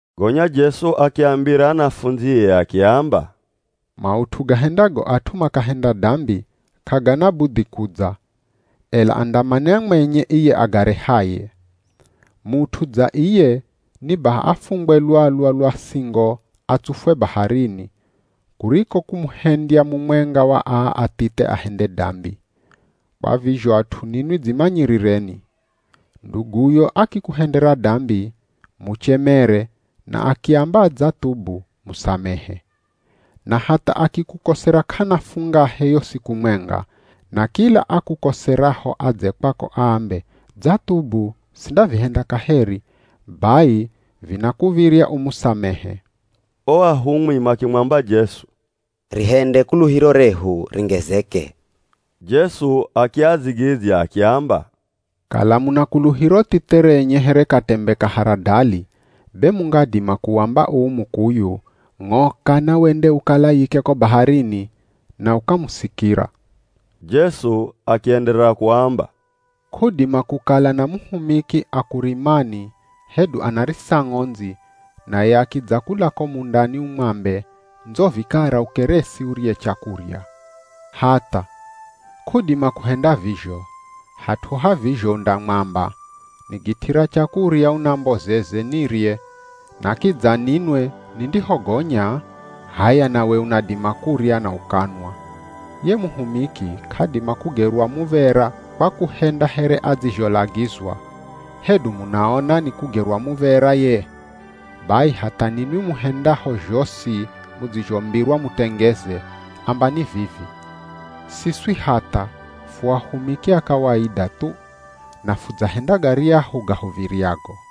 Gonya Jesu akiambira anafundzie akiamba, “Maut'u gahendago at'u makahenda dambi k'agana budhi kudza, ela andamanya mwenye iye agarehaye. Mut'u dza iye ni baha afungwe lwalwa lwa singo atsufwe baharini, kuriko kumuhendya mumwenga wa aa athithe ahende dambi. Kwa vizho at'u ninwi dzimanyirireni! “Nduguyo akikuhendera dambi, muchemere na akiamba adzathubu musamehe. Na hatha akikukosera k'ana fungahe yo siku mwenga, na kila akukoseraho adze kwako aambe, ‘Dzathubu, sindavihenda kaheri,’ bai vinakuv̱irya umusamehe.” O ahumwi makimwamba Jesu, “Rihende kuluhiro rehu ringezeke.” Jesu akiadzigidzya akiamba, “Kala muna kuluhiro thithe renye here katembe ka haradali be mungadima, kuwamba uu mukuyu, ‘Ng'oka na wende ukalayike ko baharini,’ na ukamusikira.” Jesu akienderera kuamba, “K'udima kukala na muhumiki akurimani hedu anarisa ng'ondzi naye akidza kula ko mundani umwambe, ndzo vikara ukeresi urye chakurya. Hatha! K'udima kuhenda vizho, hat'u ha vizho undamwamba, ‘Nigit'ira chakurya unambozeze nirye na kidza ninwe nindihogonya, h'aya nawe unadima kurya na ukanwa.’ Ye muhumiki k'adima kugerwa muv̱era kwa kuhenda here adzizholagizwa, hedu munaona ni kugerwa muv̱era ye? Bai hatha ninwi muhendaho zhosi mudzizhombirwa mutengeze, ambani vivi, ‘Siswi hatha, fu ahumiki a kawaida thu, na fudzahenda garyahu gahuv̱iryago.’”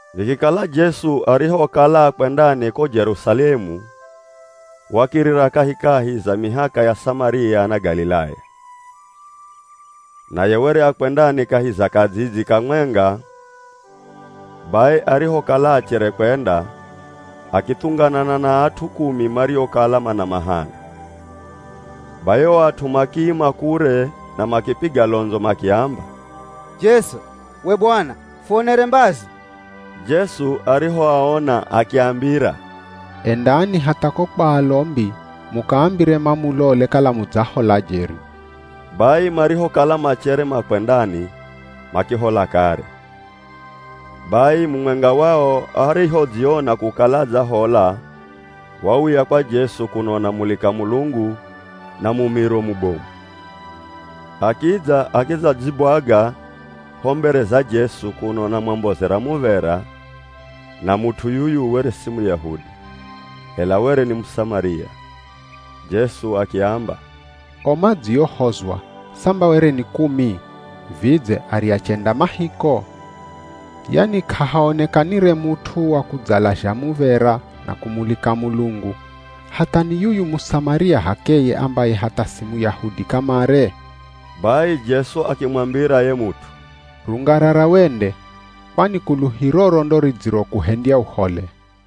Vikikala Jesu arihokala akwendani ko Jerusalemu wakirira kahikahi za mihaka ya Samaria na Galilaya. Naye were akwendani kahi za kadzidzi kamwenga, bai arihokala achere kwenda, akithunganana na at'u kumi mariokala mana mahana. Bai o at'u makiima kure na makipiga londzo makiamba, “Jesu! We Bwana! Fuonere mbazi!” Jesu arihoaona akiambira, “Endani hatha ko kwa alombi mukaambire mamulole kala mudzahola jeri.” Bai marihokala machere makwendani makihola kare. Bai mumwenga wao arihodziona kukala adzahola wauya kwa Jesu kuno anamulika Mulungu na mumiro mubomu. Akidza, akidzadzigwaga ho mbere za Jesu kuno anamwambozera muv̱era na mut'u yuyu were si Muyahudi, ela were ni Musamaria. Jesu akiamba, “O madziohozwa samba were ni kumi, vidze arya chenda ma hiko? Yani k'ahaonekanire mut'u wakudzalazha muv̱era na kumulika Mulungu, hatha ni yuyu Musamaria h'akeye ambaye hatha si Muyahudi kamare?” Bai Jesu akimwambira ye mut'u “Rungarara wende, kwani kuluhiroro ndo ridzirokuhendya uhole.”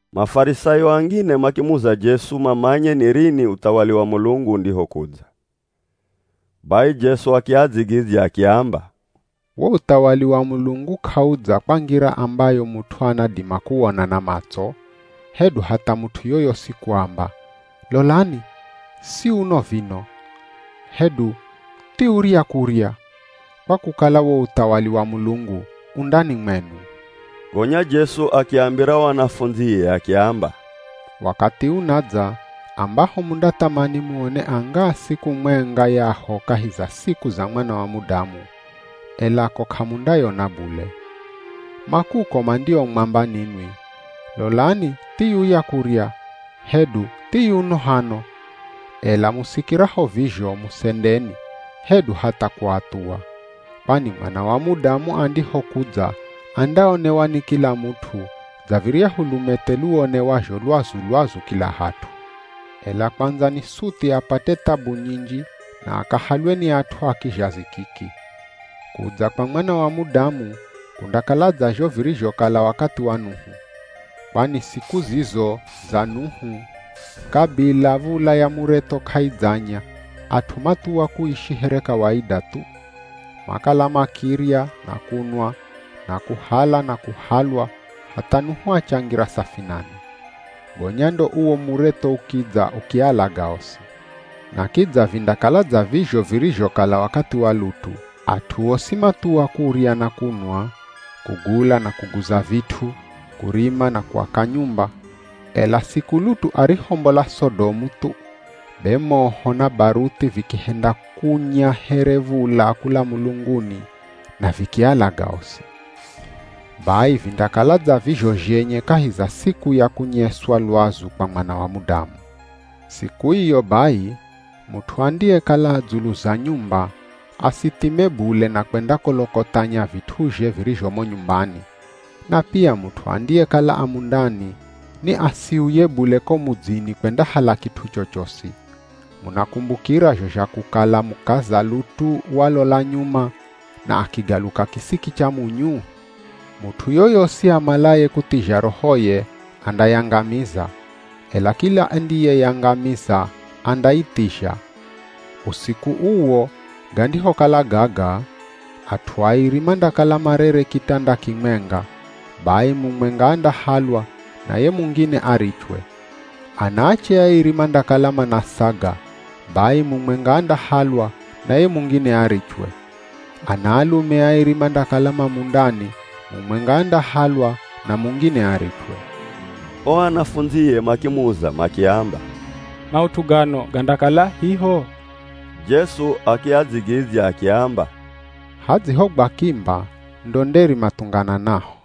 Mafarisayo angine makimuza Jesu mamanye ni rini uthawali wa Mulungu undihokudza. Bai Jesu akiadzigidzya akiamba, “Wo uthawali wa Mulungu k'audza kwa ngira ambayo mut'u anadima kuwona na matso, hedu hatha mut'u yoyosi kuamba, ‘Lolani si uno vino!’ hedu ‘Thiurya kurya!’ kwa kukala wo uthawali wa Mulungu u ndani mwenu.” Gonya Jesu akiambira o anafundzie akiamba, “Wakathi unadza ambaho mundathamani muone angaa siku mwenga yaho kahi za siku za Mwana wa Mudamu, ela ko k'amundayona bule. Ma kuko mandiomwamba ninwi, ‘Lolani thiyuya kurya!’ hedu ‘Thiyuno hano!’ ela musikiraho vizho musendeni, hedu hatha kuathuwa. Kwani Mwana wa Mudamu andihokudza andaonewa ni kila mut'u dza viryahu lumethe luonewazho lwazu-lwazu kila hat'u. Ela kwandza ni suthi apate thabu nyinji na akahalwe ni at'u a kizhazi kiki. Kudza kwa Mwana wa Mudamu kundakala dza zho virizhokala wakathi wa Nuhu. Kwani siku zizo za Nuhu kabila v̱ula ya muretho k'aidzanya, at'u mathuwa kuishi here kawaida thu. Makala makirya na kunwa, na kuhala na kuhalwa hatha Nuhu achangira safinani. Gonya ndo uwo muretho ukidza ukialaga osi. Na kidza vindakala dza vizho virizhokala wakathi wa Lutu. At'u osi mathuwa kurya na kunwa, kugula na kuguza vit'u, kurima na kuaka nyumba. Ela siku Lutu arihombola Sodomu thu, be moho na baruthi vikihenda kunya here v̱ula kula mulunguni na vikialaga osi. Bai vindakala dza vizho zhenye kahi za siku ya kunyeswa lwazu kwa Mwana wa Mudamu. Siku iyo bai, mut'u andiyekala a dzulu za nyumba asithime bule na kwendakolokothanya vit'uzhe virizho mo nyumbani, na pia mut'u andiyekala a mundani, ni asiuye bule ko mudzini kwendahala kit'u chochosi. Munakumbukira zho zha kukala mukaza Lutu walola nyuma na akigaluka kisiki cha munyu? Mut'u yoyosi amalaye kuthizha rohoye andayangamiza, ela kila andiyeyangamiza, andaithizha. Usiku uwo gandihokala gaga, at'u airi mandakala marere kitanda kimwenga, bai mumwenga andahalwa na ye mungine arichwe. Anaache airi mandakala manasaga, bai mumwenga andahalwa na ye mungine arichwe. Ana alume airi mandakala ma mundani mumwenga andahalwa na mungine arichwe.” O anafundzie makimuza makiamba, “Maut'u gano gandakala hiho?” Jesu akiadzigidzya akiamba, “Hadzihogwa kimba, ndo nderi mathungananaho.”